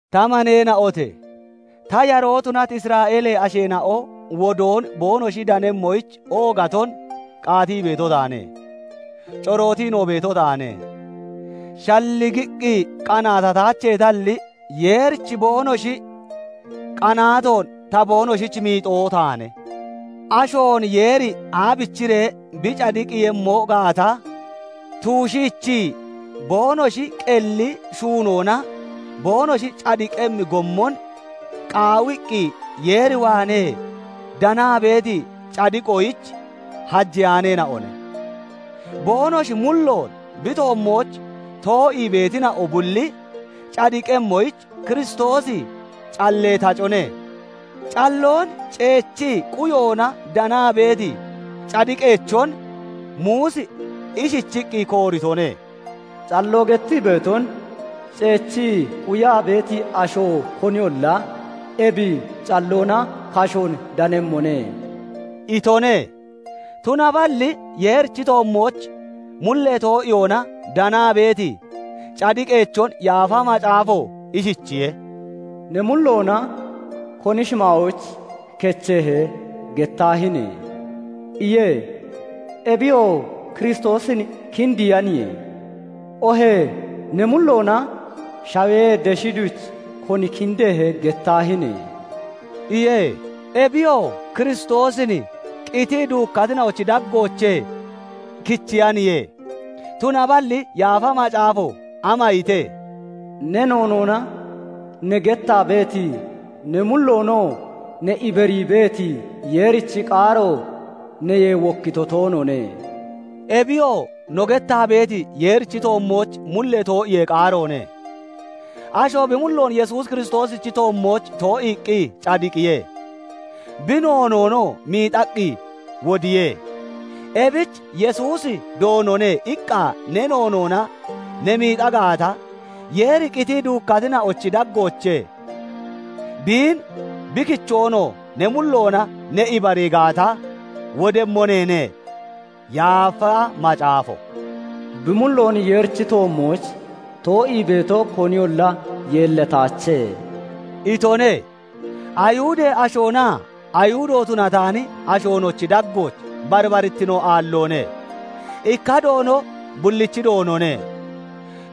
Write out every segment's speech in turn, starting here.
Ta maneena'ote! Ta yaroo tunati isra'eelee asheena'o wodoon boonoshi danemmoyich oogaton qaatii beeto taane; corootiinoo beeto taane. Shalligiqqi qanaatataacheetalli, Yeerich boonoshi qanaatoon ta boonoshich miixoo taane. Ashoon Yeeri aabichiree bi cadiqqiiyemmo gaata tuushiichii, boonoshi qelli shuunoona boonoshi cadiqemmi gommon qaawiqqi Yeer waanee danaa beeti cadiqoyich hajeyaaneena'one. Boonoshi mulloon bi toommooch too'ii beetina'o bulli cadiqemmoyich Kiristoosi callee tacone. Calloon ceechii quyoona danaa beeti cadiqeechon Muusi ishichiqqi kooritone; "Calloo gettii beeton ceechii quyaa beeti asho koniyolla ebi calloona kashoon danemmone" itone. Tunaballi Yeerichi toommooch mullee too'iyoona danaa beeti cadiqeechon Yaafa Macaafo ishichiye:- "Ne mulloona 'Koni shimaayooch kechehe?' gettaahine!" iye; ebiyoo Kiristoosin kindiiyaniye; oohee "Ne mulloona 'Shawee deshi duch koni kindehe?' gettaahine!" iye; ebiyoo Kiristoosin qitii duukkatina'ochi daggoochee kichiyaniye. Tunaballi Yaafa Macaafo ama ite? Ne noonoona ne gettaa beeti, ne mulloonoo ne ibarii beeti Yeerichi qaaro neyee wokkito toonoone; ebiyoo no gettaa beeti, Yeerichi toommooch mullee too'iyee qaaroone. Asho bi mulloon Yesuus Kiristoosichi toommooch too'iiqqi cadiqiye; bi noonoonoo miixaqqi wodiye. Ebich "Yesuusi Doonone" iqqa ne noonoona ne miixaa gaata, Yeeri qitii duukkatina'ochi daggoochee biin bi kichoonoo ne mulloona ne ibarii gaata, wodemmo neene. Yaafa Macaafo "Bi mulloon Yeerichi toommooch too'ii beeto koniyolla yeellataache" itone. Ayihudee ashoonaa Ayihudo tunataani ashoonochi daggooch barbarittino aalloone; ikka Doono bullichi Doonone.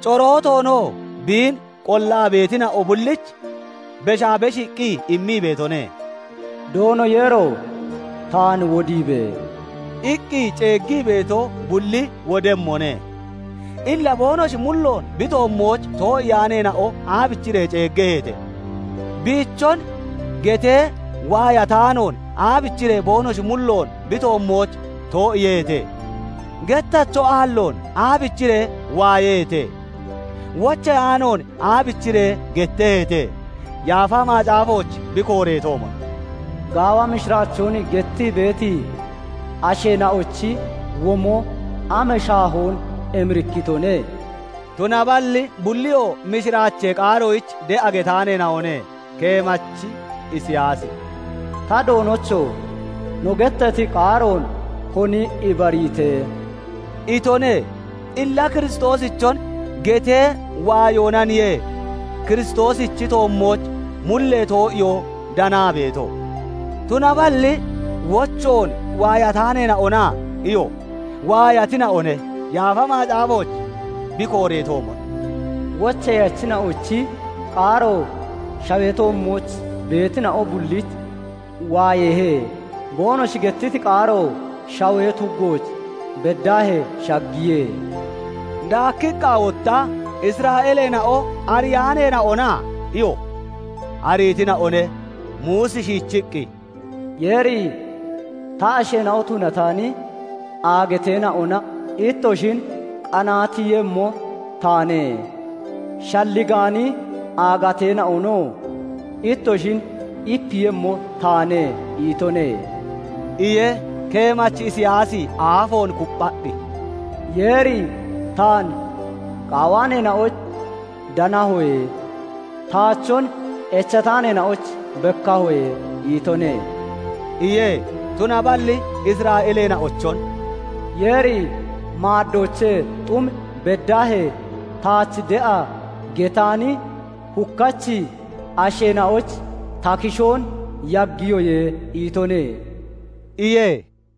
Corootoonoo biin qollaa beetina'o bullich beshaa beshiiqqi immii beetone. "Doono Yeero! Taan wodiibe!" iqqi ceeggii beeto bulli wodemmone. Illa boonoshi mulloon bi toommooch too'iyaaneena'o aabichiree ceeggeheete? Biichon getee waayataanoon aabichiree boonoshi mulloon bi toommooch too'iiyeheete? Gettacho aalloon aabichiree waayeheete? Wocheyaanoon aabichiree getteheete? Yaafa Macaafooch bi kooreetoomon. "Gaawa mishiraachoon gettii beeti asheena'ochi womo am shaahoon emirikkitone!" Tunaballi bulliyoo mishiraachee qaaroyich de'a getaaneena'one. Keemachi Isiyaasi "Ta Doonocho! No gettati qaaroon koni ibariite?" itone. Illa Kiristoosichon getee waayoonaniye Kiristoosichi toommooch mullee too'iyoo danaa beeto. Tunaballi "Wochoon waayataaneena'ona?" iyo. Waayatina'one. Yaafa Macaafooch bi kooreetoomon, "Wocheyachina'ochi qaaro shawee toommooch beetina'o bullich waayeehe; Boonoshi gettiti qaaro shawee tuggooch beddaahee shaggiye." Daakiqqa wotta, "Isra'eeleena'o ariyaaneena'ona?" iyo. Ariitina'one. Muusi shiichiqqi, "Yeeri 'Ta asheena'o tunataani aagateena'ona ittoshin qanaatiiyemmo taane; Shalligaani aagateena'onoo ittoshin ipiiyemmo taane' itone" iye. Keemachi Isiyaasi aafoon kupphaqqi, "Yeeri 'Taan qaawaaneena'oyich danahoye; taachon echataaneena'oyich bekkahoye' itone" iye. Tunaballi Isra'eeleena'ochon "Yeeri 'Maaddoochee xum beddaahee taach de'a getaani hukkachi asheena'oyich ta kishoon yaggiyoye' itone" iye.